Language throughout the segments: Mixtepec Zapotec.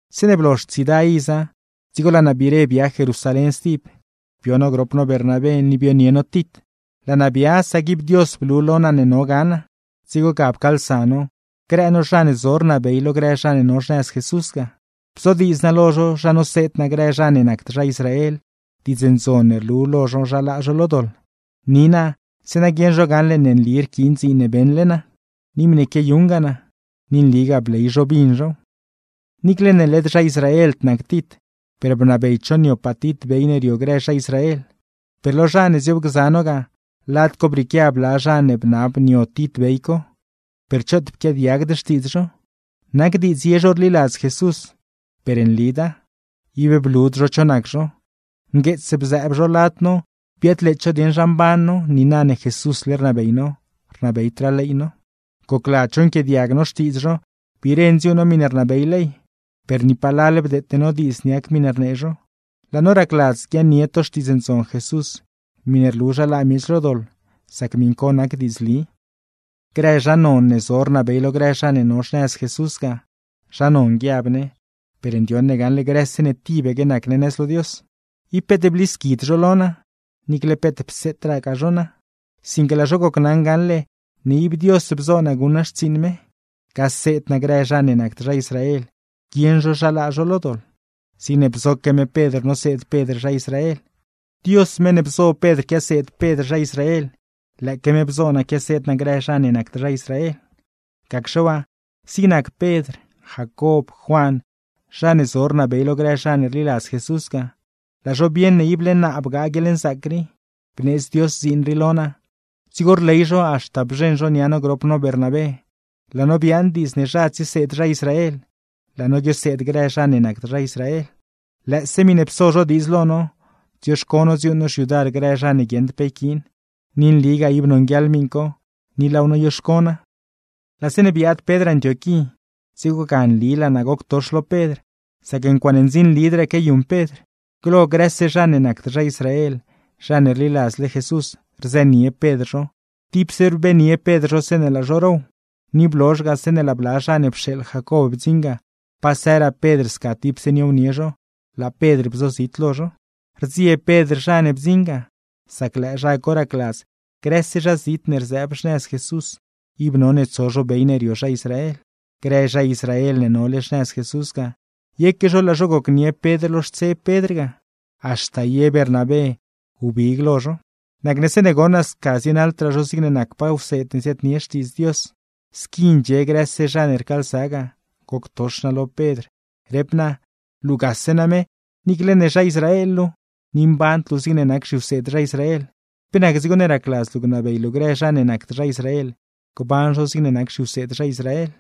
Zeeṉe blozh tsiida iza, dzigo laa naa biire bia Jerusalén stib, bio no grop no Bernabé, ni bionie no Tit. Laa naa bia, sac ib Dios blu lo naa ne no ga naa. Dzigo ga pcaalsa no grë no zha ne zo rnabey lo grë zha ne no xnëz Jesús ga, bzodiidz naa lo zho zha noseed naa grë zha ne nacd zha Israel Diidz Ndzon ne rlu lo zho zha laa zho lo doḻ, ni naa zeeṉa guieṉ zho gaṉle ne nli rquiin dziin ne beṉle naa, ni miṉe quiayuṉgaa naa. Ni nligaa bley zho bin zhow. Niicle ne led zha Israeld nac Tit, per bnabeyd zho niopaa Tit bey ne rio grë zha Israel. Per lo zha ne zioobgza no ga, lad co brieequia bla zha ne bnab nio Tit bey co, per choot pquiaadiagd xtiidz zho. Nac diidz ye zho rliladz Jesús, per nlida; ib blud zho cho nac zho, ngueets bzëëb zho lad no biadleets zho dieṉ zha mban no, niina ne Jesúsle rnabey no, rnabeydraa ley no. Gocladz zho nquiaadiag no xtiidz zho, biire ndziuuṉ no miṉe rnabey ley. Per ni palal bdeete no diidz niac miṉe rnee zho, laa no racladz guiaaṉnie to Xtiidz Ndzon Jesús miṉe rlu zha laa miech lo doḻ, sac miṉ co nac diidzli. Grë zha non ne zo rnabey lo grë zha ne no xnëz Jesús ga (zha non guiab ne, per ndioṉ ne gaṉle grëse ne tibaque nac ne nëz lo Dios) ib peet blisquid zho lo naa, niicle peet pseetragaa zho naa. Sinque laa zho gocnaṉ gaṉle ne ib Dios bzoo naa guṉ naa xtsiiṉ me, gaseed naa grë zha ne nacd zha Israel guieṉ zho zha laa zho lo doḻ; zigne bzoque me Pedr noseed Pedr zha Israel. Dios meṉ ne bzo Pedr quiaseed Pedr zha Israel, lëëque me bzo naa quiaseed naa grë zha ne nacd zha Israel. Gacxe waa, zig nac Pedr, Jacob, Juan, zha ne zo rnabey lo grë zha ne rliladz Jesús ga, laa zho bieṉ ne ible naa bgaa guieḻnzaac rii, bneedz Dios dziin rii lo naa. Dzigo rley zho haxta bzheṉ zho nia no grop no Bernabé, laa no biaaṉ diidz ne zha tsieseed zha Israel, laa no guioseed grë zha ne nacd zha Israel. Lëëse miṉe pso zho diidz lo no, dzioxco no dziuuṉ no xyudar grë zha ne guieṉd pe yquiin; ni nligaa ib nonguieḻ miṉ co ni laaw noyoxco naa. Laa zeeṉe biaad Pedr Antioquí, dzigo ga nli laa naa goctox lo Pedr, sac ncuaaṉe ndzinlidraa quiayuṉ Pedr. Glo, grëse zha ne nacd zha Israel zha ne rliladzle Jesús, rzënie Pedr zho, tipse rbenie Pedr zho zeeṉe laa zho row; ni blozh ga, zeeṉe laa bla zha ne pxeeḻ Jacob bdziṉ ga, pasëraa Pedr sca tipse niownie zho, laa Pedr bzozit lo zho. Rdzieb Pedr zha ne bdziṉ ga, sac lëë zha co racladz, grëse zha zit ne rzëëb xnëz Jesús ib none tso zho bey ne rio zha Israel. Grë zha Israel ne nole xnëz Jesús ga, yeque zho laa zho gocnie Pedr lo xtseb Pedr ga, haxta ye Bernabé wbig lo zho. Nacne zeeṉe goṉ naa sca zienaḻdraa zho zigne nacpaa wseed ne ziaadnie Xtiidz Dios, squi ndxie grëse zha ne rcaalsa ga goctox naa lo Pedr, rep naa: “Luugase name niicle ne zha Israel luu, ni mband luu zigne nac zhiwseed zha Israel, ¿pe nac dzigo ne racladz luu gnabey luu grë zha ne nacd zha Israel, gban zho zigne nac zhiwseed zha Israel?”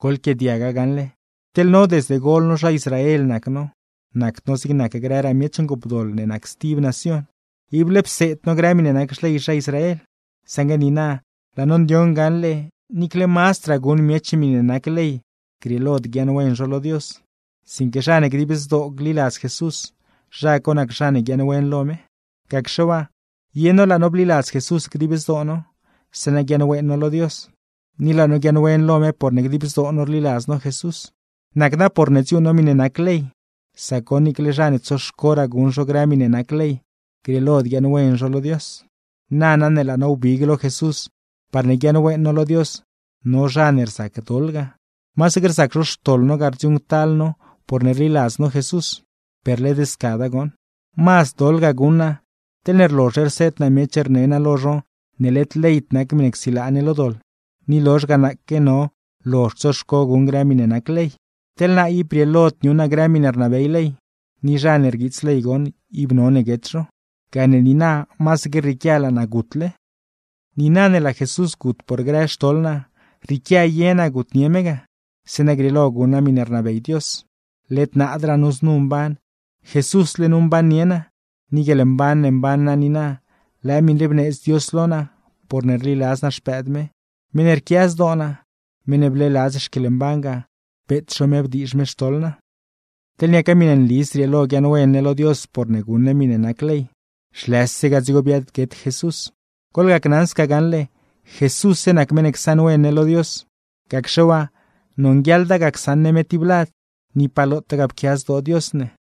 Goḻquiaadiaga gaṉle, teḻ no desde gol no zha Israel nac no, nacd no zigne nac grëraa miech ngoopdoḻ ne nac stib nacion; ible pseed no grë miṉe nac xley zha Israel. Saṉgue niina laa no ndioṉ gaṉle, niicle mazdraa guṉ miech miṉe nac ley grieelod guiaaṉwen zho lo Dios, sinque zha ne dib zdoo gliladz Jesús, zha co nac zha ne guiaaṉwen lo me. Gacxe waa, ye no laa no bliladz Jesús dib zdoo no, zeeṉa guiaaṉwen no lo Dios; ni laa no guiaaṉwen lo me porne dib zdoo no rliladz no Jesús, nacda porne dziuuṉ no miṉe nac ley. Sac goṉ niicle zha ne tsoxcoraa guṉ zho grë miṉe nac ley, grieelod guiaaṉwen zho lo Dios. Nana ne laa no wbig lo Jesús parne guiaaṉwen no lo Dios, no zha ne rzac doḻ ga. Masaque rzac zho xtoḻ no ga rdziuuṉctal no porne rliladz no Jesús, per, ¡led scada goṉ! Mazd doḻ ga guṉ naa, teḻne rlozhle rseed naa miech rne naa lo zho ne led leyd nac miṉe csilaa ne lo doḻ, ni lozh ga naaque no lozhd tsoxco guṉ grë miṉe nac ley. Sac teḻ naa, ib brieelod niuṉ naa grë miṉe rnabey ley, ni zha ne rguiits ley goṉ ib none guet zho; gane niina masaque rrieequia laa naa gutle. Niina ne laa Jesús gut por grë xtoḻ naa, rrieequia ye naa gutnie me ga, zeeṉa grieelo guṉ naa miṉe rnabey Dios. Led naadraa nu znu mban, Jesúsle nu mbannie naa, ni guieḻmban ne mban naa niina, lëë miṉ rii bneedz Dios lo naa porne rliladz naa Xpëëd me, meṉ ne rquia zdoo naa, meṉ ne bleeladz xquieḻmban ga beet zho me bdiizh me xtoḻ naa. Nana, teḻne niaca miṉe nli zrieelo guiaaṉwen ne lo Dios porne guṉ ne miṉe nac ley, zhlëse ga dzigo biaadguet Jesús. Goḻgacnaṉ sca gaṉle, Jesússe nac meṉ ne csaṉwen ne lo Dios, gacxe waa nonguieḻda ga csaṉ ne me tiblad, ni pa lotaa ga pquia zdoo Dios ne.